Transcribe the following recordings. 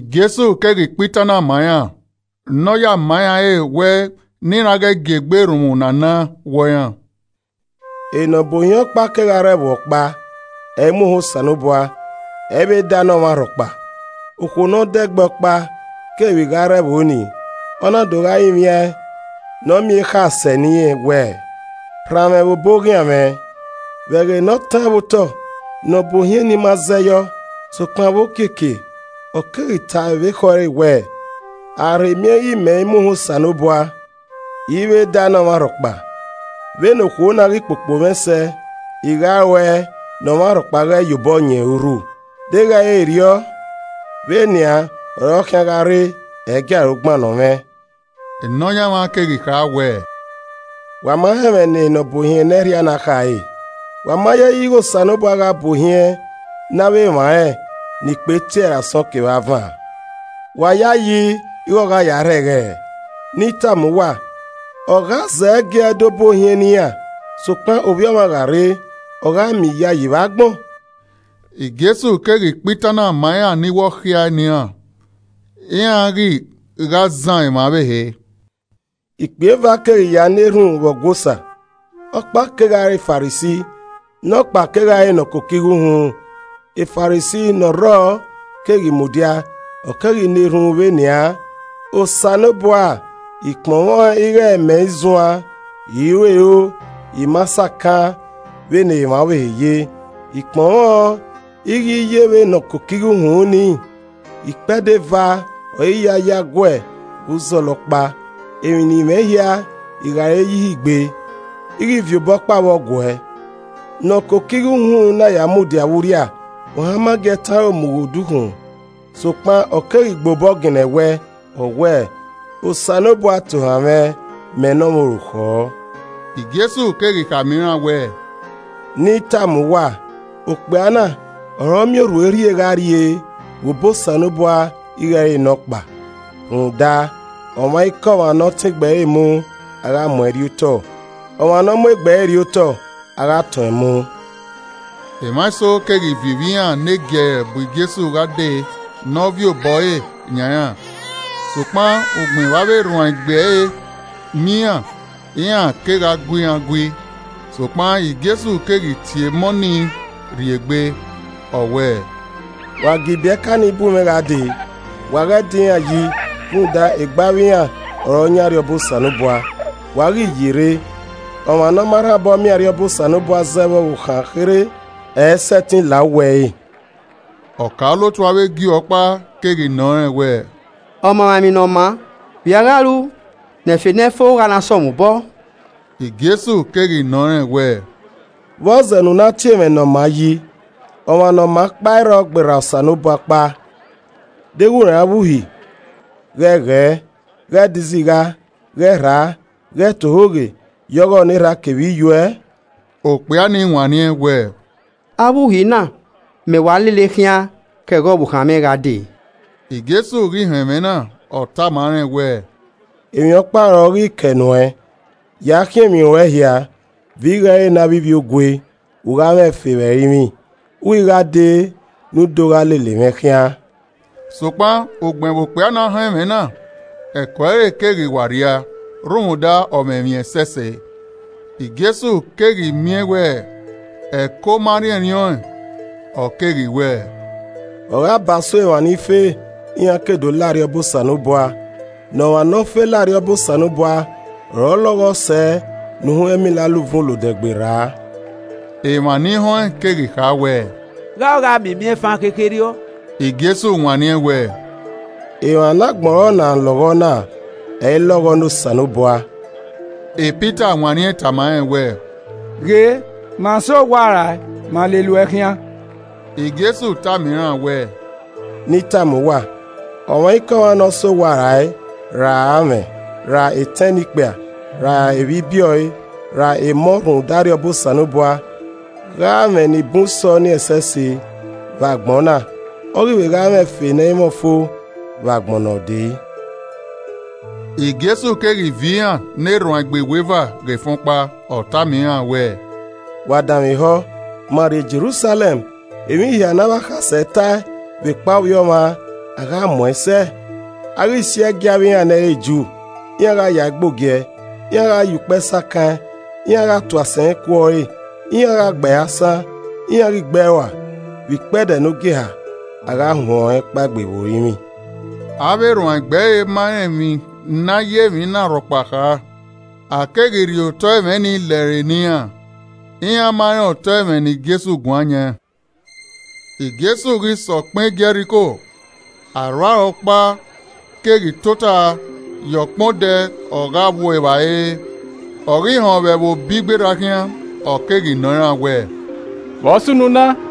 Jesu keghi kpa itan na ma iran ne ọ ya ma iran ẹre wẹ ne iran ghẹ gie egbe erhunmwu ne a na wọ iran. “Nọbuohiẹn ọkpa kegha re ẹvbo ọkpa, ẹ i mu ohan Osanobua, ẹ i vbe da ne ọmwa rhọkpa. Okhuo ne ọ dẹgbẹ ọkpa keghi vbe gha rre ẹvbo nii, ọ na do gha rinmwian ẹn ne ọ miẹn ekhae sẹ ne irẹn wẹẹ, ‘Ran mwẹ vbe obọ oghian mwẹ.’ Vbe ẹghẹ ne ọ taẹn vbe otọ, nọbuohiẹn nii ma zẹyọ, sokpan vbe okiekie, ọ keghi tae vbe ekhọe ẹre wẹẹ, ‘A gha rhe miẹn ighẹ mẹ i muohan Osanobua, I i vbe da ne ọmwa rhọkpa, vbe ne okhuo na ghi kpokpo mwẹ sẹ, I gha ruẹe ne ọmwa rhọkpa ghẹ ye ohọ yẹn ọre urhu, deghẹ ẹ i re erriọ, vbe nian ọre ọ khian gha rre, ẹ i gie aro gbannọ mwẹ.’” Nọyaẹnmwa keghi kha wẹẹ, “Wa ma họn ẹmwẹ ne nọbuohiẹn ne ẹrhia na khare. Wa ma yayi ighẹ Osanobua gha buohiẹn ne avbe emwa rẹn ni kpe tie ẹre asọn kevbe avan? Wa yayi ighẹ ọ gha yae rhẹghẹrẹ? Ne I tama uwa, ọ gha zẹgiẹ do buohiẹn ne iran. Sokpan Ovbi Ọmwa gha rre, ọ gha miẹn iyayi vbe agbọn?” Jesu keghi kpa itan na ma iran ni wẹ ọ khuiae ne iran, iran ghi gha zan emwa ọvbehe. “Ikpia eva keghi ya na erhunmwu vbe Ọgua Osa. Ọkpa kegha re Farisi, nọkpa kegha re ne ọ koko igho uhunmwu, E Farisi ne ọ rrọọ keghi mudia, ọ keghi na erhunmwu vbe nian: ‘Osanobua, I kpọnmwẹ ọn ighẹ mẹ i zuan, I i ru ero, I ma sakaan vbe ne emwa ọvbehe ye, I kpọnmwẹ ọn ighẹ I i ye vbe ne ọ koko igho uhunmwu nii. Ikpẹdẹ eva ọre I ya yo aguẹ vbe uzọla ọkpa. Emwi ne I mwẹ hia, I gha gha ẹre ye ihe igbe, I ghi viọ obọkpa vbọ guẹ.’ Ne ọ koko igho uhunmwu na ya mudia vbe urria, ohan ma gi ẹe tọn aro mu ghe odukhunmwu, sokpan ọ keghi gba obọ ginna ẹwẹe, ọ wẹẹ, ‘Osanobua tohan mwẹ, mẹ ne ọmwa orukhọ.’” Jesu keghi khama iran wẹẹ, “Ne I tama uwa, okpia na ọre ọ miẹn orhue rhie gha rrie vbe obọ Osanobua ighẹ ẹ i re nọkpa. Rhunmwuda, ọmwaikọmwa ne ọ tọn egbe ẹre mu, a gha mu ẹn rriotọ, ọmwa ne ọ mu egbe ẹre rriotọ, a gha tọn ẹn mu.” Emwa eso keghi viọ ivbi iran negiẹrẹ bu Jesu gha dee ne ọ viọ obọ ẹre yan iran. Sokpan ugbẹn vbe avbe erhuanegbe ẹre miẹn iran, iran kegha gu iran gui. Sokpan Jesu keghi tie emọ ni rri egbe, ọ wẹẹ, “Wa gie ibiẹka nii bu mwẹ gha dee! Wa ghe da iran yi rhunmwuda egbe avbe iran ọre ọ yan Arriọba Osanobua. Wa ghi yerre, ọmwa ne ọ ma rhan obọ miẹn Arriọba Osanobua zẹ vbe ọvbokhan kherhe, ẹ i sẹtin la uwu ẹre.” Ọkaolotu avbe Ju ọkpa keghi nọ rẹn wẹẹ, “Ọmamwaemwi ne ọ maa, Vbe i a gha ru ne ẹfe nẹi fo gha na sẹ mwẹ obọ?” Jesu keghi nọ rẹn wẹẹ, “Vbọzẹ ne u na tie mwẹ ne ọ maa yi? Ọmwa ne ọ maa ọkpa i rrọ gberra Osanobua ọkpa. Deghẹ u rẹn avbe Uhi: ‘Ghẹ ghẹ, ghẹ de izigha, ghẹ rhaa, ghẹ ta ohoghe, ya ọghọ ne erha a kevbe iye uẹ.’” Okpia ni wanniẹn wẹẹ, “Avbe uhi na mẹ wa lele khian, ke ẹghẹ ọvbokhan mwẹ gha dee.” Jesu ghi họn ẹmwẹ na, ọ tama rẹn wẹẹ, “Emwi ọkpa ọre ọ ghi kẹe nuẹn, ya khiẹn emwi ruẹn hia, viọ igho ẹre ne avbe ivbiogue, u gha mwẹ ẹfe vbe ẹrinmwi, u ghi gha dee ne u do gha lele mwẹ khian.” Sokpan, ugbẹn vbe okpia na họn ẹmwẹ na, ẹko ẹre keghi wa rhia rhunmwuda ọ mwẹ emwi ẹsẹse. Jesu keghi miẹn wẹ ẹko ma rhiẹnrhiẹn ọẹn, ọ keghi wẹẹ, “Ọ gha ba so emwa ni fe iran ke do la Arriọba Osanobua. Ne ọmwa ne ọ fe lao Arriọba Osanobua ọre ọ lọghọ sẹ ne uhunmwu ẹmila la uvun olodẹ gberra.” Emwa ni họn ẹn keghi kha wẹẹ, “Gha ọ gha miẹn imiẹnfan khekherriọ?” Jesu wanniẹn wẹẹ, “Emwa ne agbọn ọre ọna lọghọ na, ẹ i lọghọ ne Osanobua.” Pita wanniẹn tama rẹn wẹẹ, “Ghe, ma sẹ owa rae, ma lele uẹ khian.” Jesu tama iran wẹẹ, “Ne I tama uwa: Ọmwaikọmwa ne ọ sẹ owa rae, ra amwẹ, ra etẹn ne ikpia, ra evbibiẹ ọe, ra emọ rhunmwuda Arriọba Osanobua, gha mwẹ ni bun sẹ ọnii ẹsẹse vbe agbọn na. Ọ ghi vbe gha mwẹ ẹfe ne ẹ i mwẹ ọfo vbe agbọn ne ọ dee.” Jesu keghi viọ iran ne erhuanegbe iweva ghe efẹn ọkpa, ọ tama iran wẹẹ, “Wa danmwehọ, ma rrie Jerusalẹm, emwi hia ne avbe akhasẹ tae vbekpa Ovbi Ọmwa, a gha mu ẹn sẹ. A gha si ẹe gie avbe iran ne ẹ i re Ju, iran gha yae ghe ogiẹ, iran gha ya ukpẹ sakan ẹn, iran gha tu asẹn ku ọre. Iran gha gbe ẹre asan, iran ghi gbe ẹe rua, vbe ikpẹdẹ ne ọ gieha, a gha huẹn ọnrẹn kpaegbe vbe orinmwi.” Avbe erhuanegbe ẹre ma rẹn emwi ne a ya emwi na rhọkpa kha, a keghi rhie otọe ẹmwẹ nii lẹre ne iran, iran ma rẹn otọ ẹmwẹ ne Jesu guan yan. Jesu ghi sẹ ọkpẹn Jẹriko, arhuaro ọkpa keghi tota ye ọkpẹn odẹ ọ gha vbu evbare re. Ọ ghi họn vbe ẹvbo bi gberra khian, ọ keghi nọ iran wẹẹ, “Vbe ọ sunu na?”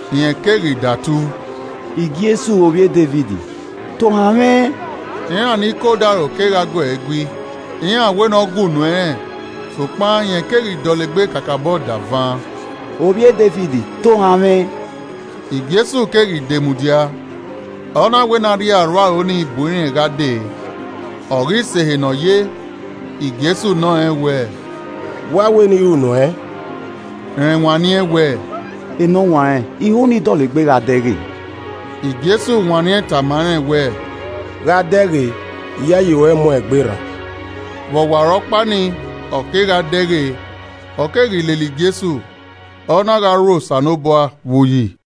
Rẹn keghi datu, “Jesu Ovbi e Devid, tohan mwẹ!” Iran ni ke odaro kegha gu ẹe gui, iran wẹ ne ọ gue unu ẹnrẹn. Sokpan rẹn keghi dọlegbe kakabọ davan: “Ovbi e Devid, tohan mwẹ!” Jesu keghi de mudia, ọ na wẹ ne a rhie arhuaro nii bu irẹn gha dee. Ọ ghi sẹ ehe ne ọ ye, Jesu nọ rẹn wẹẹ, “Vbe u a wẹ ne I ru nuẹn?” Rẹn wanniẹn wẹẹ, “Enọwanrẹn, I ho ne I dọlegbe gha dẹghe.” Jesu wanniẹn tama rẹn wẹẹ, “Gha dẹghe! Iyayi ruẹ mu ẹn egbe rran.” Vbe ọwarọkpa nii, ọ kegha dẹghe, ọ keghi lele Jesu, ọ na gha rho Osanobua vbe uyi.